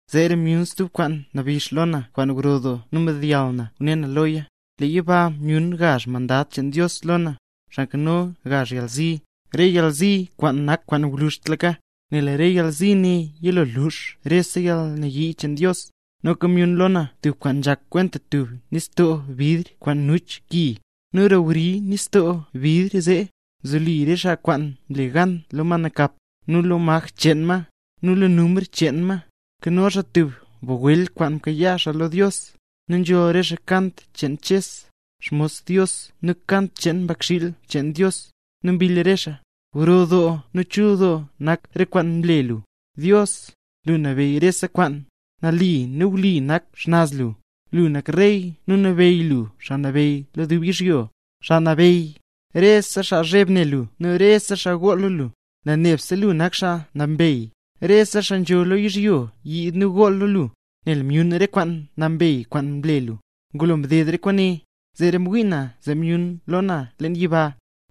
Zeera myun stub kwaan nabix lo na kwaan gro doo nu mdeyall na ngune na loya. Leen yiba myun gazh mandad cheen Dios lo na, xaa nkano gazh yalzi, re yalzi kwaan nak kwaan gwluzhtlaka, nel re yalzi ne yilo lux rese yalnayii cheen Dios. Noka myun lo na tub kwaan nzhak kwenta tub nistoo bidr kwaan nuch ki; nu roo wri nistoo bidr zee, nzoli re xaa kwaan mle gan lo ma nakap, nu lo maj cheen ma, nu lo numr cheen ma. Nkano xaa tub bagwel kwaan mkayaa xaa lo Dios. Nu nzholl re xaa kant cheen Ches, xmos Dios nu kant cheen Mbakxiil cheen Dios, nu mbill re xaa: ¡Gro doo nu chul doo nak re kwaan mle lu, Dios, lu nabeyy rese kwaan! ¡Nali nu wli nak xnaz lu; lu nak rey nu nabeyy lu xaa nabeyy lo dub yizhyo! ¡Xaa Nabeyy! Rese xaa zheb ne lu nu rese xaa gool lo lu, nel nebse lu nak xaa nambey; rese xaa nzho lo yizhyo yiid nu gool lo lu, nel myun re kwaan nambey kwaan mle lu. Ngulo mded re kwaane, zeera mwii na zee myun lo na leen yiba,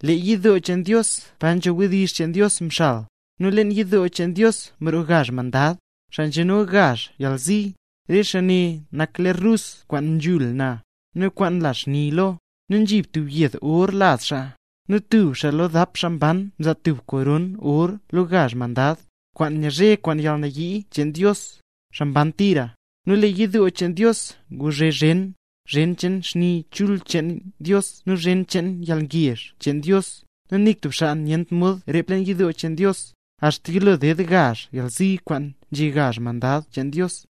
lee yidoo cheen Dios pa nzho wdizh cheen Dios mxal. Nu leen yidoo cheen Dios mroo gazh mandad, xaa nzhano gazh yalzi. Nu re xaa ne nak ler rus kwaan nzhul na, nu kwaan nla xni lo, nu nzhi tub yed or laz xaa. Nu tub xaa lo dap xaa mban mzaa tubga kop or lo gazh mandad, kwaan nyazhe kwaan yalnayii cheen Dios, xaa mban tira. Nu lee yidoo cheen Dios nguzhe zhen, zhen cheen xni chul cheen Dios nu zhen cheen yalngezh cheen Dios; nu nik tub xaa nyent mod rep leen yidoo cheen Dios, axta yilo ded gazh yalzi kwaan nzhe gazh mandad cheen Dios.